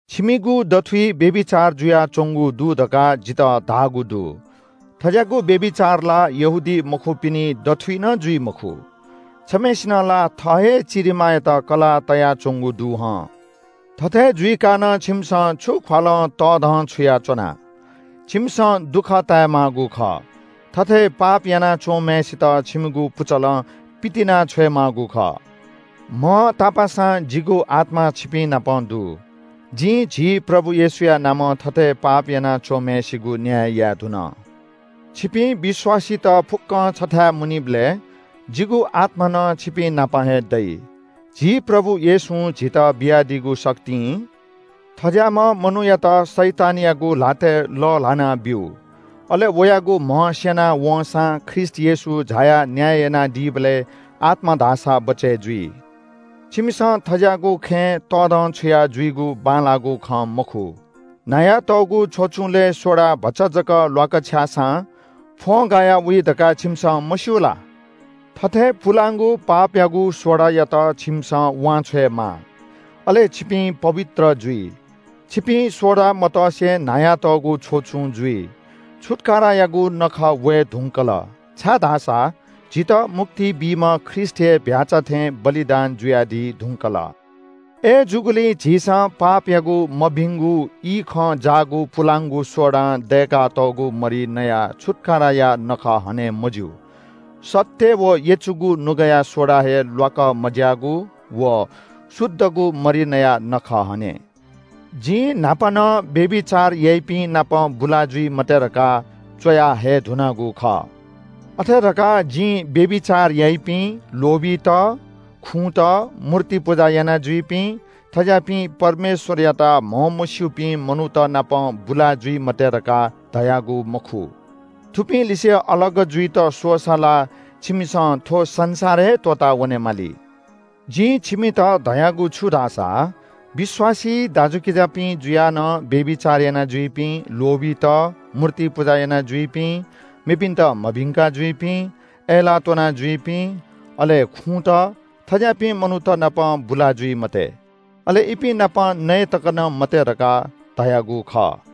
छिमिगु दथुइ व्‍यभिचार जुयाच्‍वंगु दु धकाः जितः धाःगु दु। थज्‍याःगु व्‍यभिचार ला यहूदीमखुपिनि दथुइ नं जुइ मखु। छम्‍हय्‌सिनं ला थः हे चिरिमांयात कलाः तयाच्‍वंगु दु हं। थथे जुइकाः नं छिमिसं छु ख्‍वालं तःधंछुया च्‍वना? छिमिसं दुःख ताये माःगु खः। थथे पाप यानाच्‍वंम्‍हय्‌सित छिमिगु पुचलं पितिना छ्वयेमाःगु खः। म्‍हं तापाःसां जिगु आत्‍मा छिपिंनाप दु। जिं झी प्रभु येशूया नामं थथे पाप याना च्‍वंम्‍हय्‌सिगु न्‍याय याये धुन। छिपिं विश्‍वासीत फुक्‍कं छथाय् मुनीबलय् जिगु आत्‍मा नं छिपिंनाप हे दइ। झी प्रभु येशूं झीत बियादीगु शक्तिं थज्‍याःम्‍ह मनूयात शैतानयागु ल्‍हातय् लःल्‍हानाब्‍यु, अले वयागु म्‍ह स्‍यना वंसां ख्रीष्‍ट येशू झायाः न्‍याय यानादीबलय् आत्‍मा धाःसा बचय् जुइ। छिमिसं थज्‍याःगु खँय् तःधंछुया जुइगु बांलाःगु खँ मखु। न्‍हायातःगु छ्वचुंलय् सोडा भचा जक ल्‍वाकछ्याःसां फ्‍वंगाया वइ धकाः छिमिसं मस्‍यू ला? थथे पुलांगु पापयागु सोडायात छिमिसं वांछ्वयेमाः, अले छिपिं पवित्र जुइ। छिपिं सोडा मतसे न्‍हायातःगु छ्वचुं जुइ। छुत्‍कारायागु नखः वये धुंकल, छाय्‌धाःसा झीत मुक्ति बीम्‍ह ख्रीष्‍ट, झीम्‍ह छुत्‍काराया चीधिकःम्‍ह भ्‍याःचा बलिदान जुयादी धुंकल। अय्‌जूगुलिं झीसं पापयागु मभिंगु इखं जाःगु पुलांगु सोडां दय्‌कातःगु मरि नयाः छुत्‍काराया नखः हने मज्‍यू। सत्‍य व यचुगु नुगःया सोडा हे ल्‍वाक मज्‍याःगु व शुद्धगु मरि नयाः नखः हने। जिं न्‍हापा नं व्‍यभिचार याइपिं नाप बुला जुइ मते धकाः च्‍वया हये धुनागु खः। अथे धकाः जिं व्‍यभिचार याइपिं, लोभीत, खुँत, मूर्ति पुजा यानाजुइपिं, थज्‍याःपिं परमेश्‍वरयात म्‍हमस्‍यूपिं मनूत नाप बुला जुइ मते धकाः धयागु मखु। थुपिंलिसे अलग जुइत स्‍वःसा ला छिमिसं थ्‍व संसार हे त्‍वःतावने माली। जिं छिमित धयागु छु धाःसा विश्‍वासी दाजुकिजापिं जुयाः नं व्‍यभिचार यानाजुइपिं, लोभीत, मूर्ति पुजा यानाजुइपिं, मेपिन्‍त मभिंका जुइपिं, अय्‌लाः त्‍वनाजुइपिं, अले खुँत – थज्‍याःपिं मनूत नाप बुला जुइ मते, अले इपिं नाप नये तक मते धकाः धयागु खः।